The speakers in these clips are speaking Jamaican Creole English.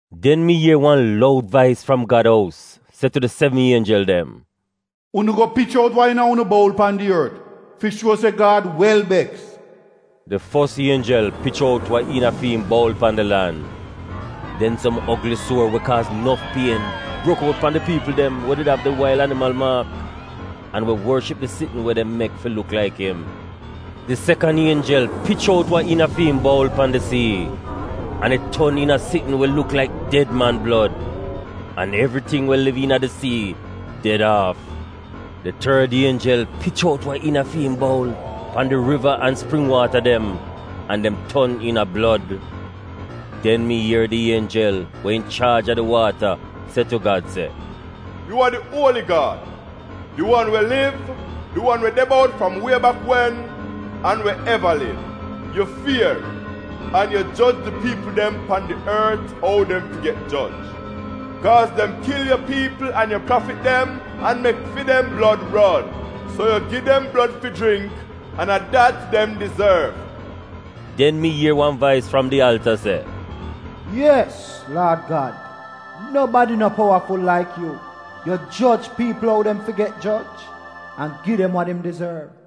Den mi ier wan loud vais fram Gad ous se tu di sevn ienjel dem, “Unu go pich out wa iina unu boul pan di ort fi shuo se Gad wel beks.” Di fos ienjel pich out wa iina fi im boul pan di lan. Den som ogli suor we kaaz nof pien brok out pan di piipl dem we av di wail animal maak, an we worship di sitn we dem mek fi luk laik im. Di sekan ienjel pich out wa iina fi im boul pan di sii, an it ton iina sitn we luk laik ded man blod, an evriting we liv iina di sii ded aaf. Di tord ienjel pich out wa iina fi im boul pan di riva an spring waata dem, an dem ton iina blod. Den mi ier di ienjel we inchaaj a di waata se tu Gad se: “Yu a di Uoli Gad, di wan we liv, di wan we de bout fram wie bak wen, an we eva liv. Yu fier, an yu joj di piipl dem pan di ort ou dem fi get joj, kaaz dem kil yu piipl an yu prafit dem an mek fi dem blod ron, so yu gi dem blod fi jringk, an a dat dem dizorv.” Den mi ier wan vais fram di alta se: “Yes, Laad Gad, nobadi no powaful laik yu, yu joj piipl ou dem fi get joj an gi dem wa dem dizorv!”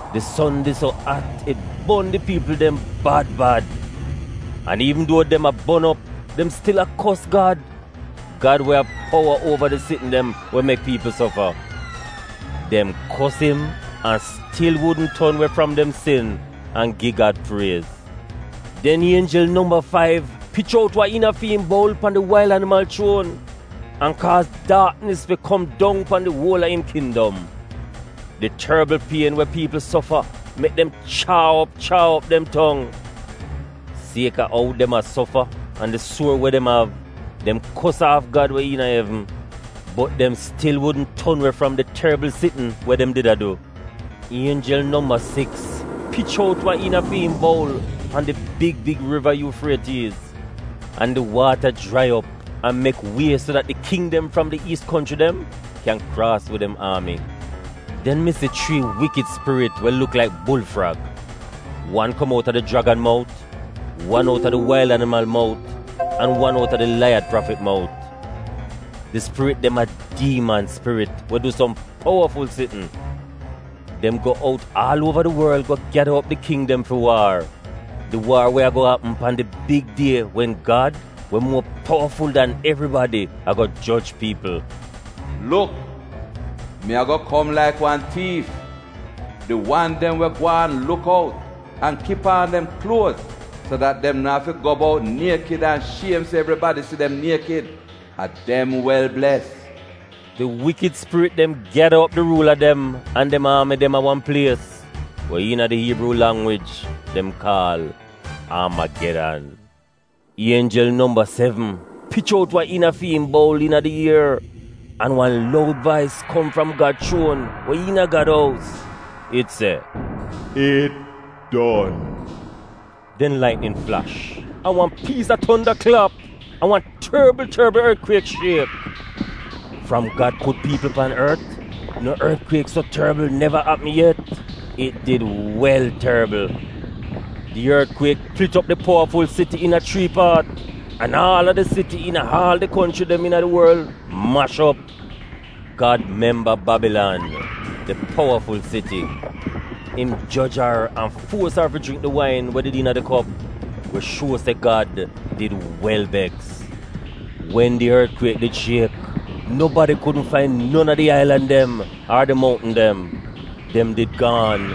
Di son did so at it bon di piipl dem bad bad. An iivn duo dem a bon op, dem stil a kos Gad, Gad we av powa uova di sitn dem we mek piipl sofa. Dem kos im an stil wudn ton we fram dem sin an gi Gad priez. Den ienjel nomba faiv pich out wa iina fi im boul pan di wail animal chuon, an kaaz daaknis fi kom dong pan di uola im kindom. Di torbl pien we piipl sofa, mek dem chaa op chaa op dem tong. Sieka ou dem a sofa an di suor we dem av, dem kos aaf Gad we iina evn, bot dem stil wudn ton we fram di torbl sitn we dem did a du. Ienjel nomba siks pich out wa iina fi im boul pan di big big riva Yuufrietiiz, an di waata jrai op an mek wie so dat di king dem fram di Iis konchri dem kyan kraas wid dem aami. Den mi si chrii iivl spirit we luk laik bulfrag; wan kom outa di jragan mout, wan outa di wail animal mout an wan outa di laiyad prafit mout. Di spirit dem a diiman spirit we du som powaful sitn. Dem go out aal uova di worl go gyada op di king dem fi waar — di waar we ago apm pan di big die wen Gad, we muo powaful dan evribadi, ago joj piipl. “Luk, mi ago kom laik wan tiif! Di wan dem we gwaan luk out an kip aan dem kluoz so dat dem na'afi go bout niekid an shiem se evribadi si dem niekid, a dem wel bles.” Di iivl spirit dem gyada op di ruula dem an dem aami de a wan plies we iina di Iibruu langwij dem kaal Aamagedan. Ienjel nomba sevn pich out wa iina fi im boul iina di ier, an wan loud vais kom fram Gad chuon we iina Gad ous, it se, “It don.” Den laitnin flash, an wan piis a tonda klap, an wan torbl torbl ortkwiek shiek. Fram Gad put piipl pan ort, no ortkwiek so torbl neva apm yet — it did wel torbl. Di ortkwiek plit op di powaful siti iina chrii paat, an aal a di siti iina aal di konchri dem iina di worl mash op. Gad memba Babilan, di powaful siti. Im joj ar, an fuos ar fi jringk di wain we did iina di kop we shuo se Gad did wel beks. Wen di ortkwiek did shiek, nobadi kudn fain non a di ailan dem ar di mountn dem — dem did gaan.